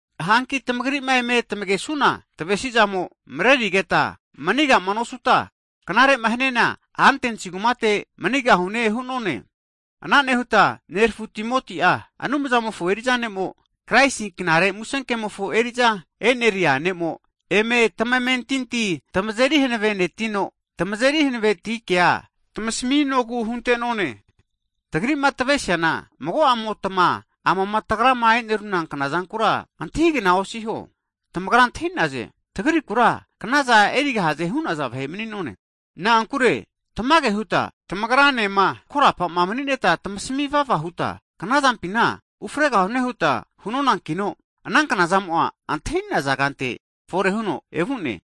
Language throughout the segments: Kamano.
Hanki tamagri'ma eme tamegesuna tavesizamo'a, marerigeta manigama nosuta, knarema haniana, Atens kumate manigahune hu'none. Ana nehuta nerafu Timoti'a, Anumzamofo eriza ne'mo Kraisi Knare Musenkemofo eriza e'neria ne'mo, eme tamamentinti tamazeri hanavenetino, tamazeri hanaveti kea tamasaminogu hunte'none. Tagri'ma tavesiana, mago'amotma amama tagrama e'neruna knazankura antahigna osiho. Tamagra antahinaze, tagrikura knazana erigahaze hu'naza vahe mani'none. Na'ankure tamage huta tamagra nema ko'ma mani'neta tamasami vava huta, knazampina ufregahune huta hunonankino, ana knazamo'a, antahinaza kante fore huno evu'ne.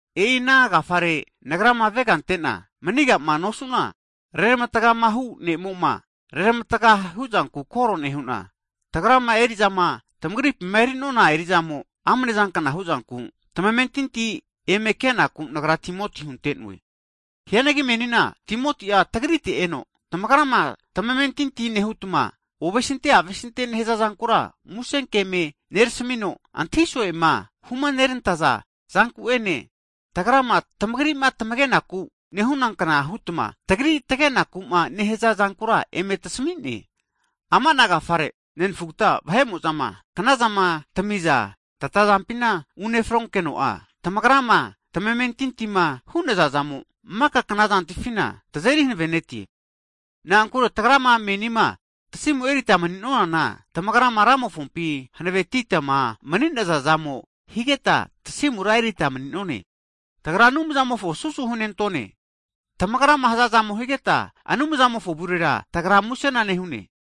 E'ina agafare nagrama avega antena manigama nosuna, reramatagamahu ne'moma reramatga huzanku koro nehu'na, tagrama eri'zama tamagripima eri'nona erizamo amnezankna huzanku, tamamentinti eme kenogu nagra Timoti hunte'noe. Hianagi menina Timoti'a tagrite eno, tamagrama tamamentinti nehutma ovesinte avesintema nehaza zankura, musenke eme nerasamino, antahi so'ema humanerantaza zanku'ene, tamagrima tamagenaku nehunankna hutma, tagrima tagenakuma nehaza zankura eme tasamine. Ama'na agafare, nenfugta vahe'mo'zama knazama tamiza tatazampima unefronkeno'a, tamagrama tamentintima hu'naza zamo maka knazantifina tazeri hanavenetie. Na'ankure tagrama menima tasimu erita mani'nonana, tamagrama Ramofompi hanavetitama mani'naza zamo higeta tasimura erita mani'none. Tagra Anumzamofo susu hunentone. Tamagrama hazazamo higeta, Anumzamofo avurera tagra musena nehune.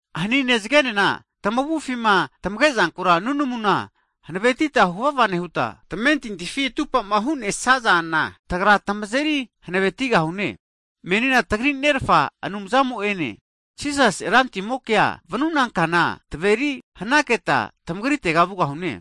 Hanine zagenena tamavufima tamagezankura nunamuna hanavetita huvava nehuta, tamamentintifima atupama hu'nesazana, tagra tamazeri hanavetigahune. Menina tagri Nerafa Anumzamo'ene, Jisasi Rantimokea vanuna kana taveri hanaketa tamagritega vugahune.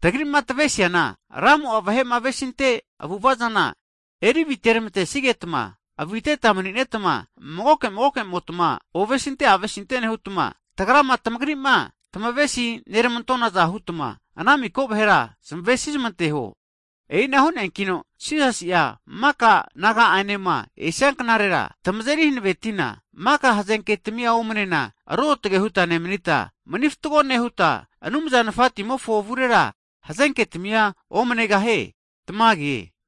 Tagri'ma tavesiana, Ramo'a vahe'ma avesinte avu'ava zana eri aviteramantesigetma aviteta maninetma, magoke magokemotma ovesinte avesinte nehutma, tamagri'ma tamavesi neramantonaza hutma, ana miko vahera tamavesizmanteho. E'ina hu'neankino, Jisasi'a maka Naga'anema esia knarera tamazeri hanavetina, maka hazenketamia omnena, ruotge huta nemanita, manifatgo nehuta, Anumza Nafatimofo avurera hazenketamia omanegahie. Tamage.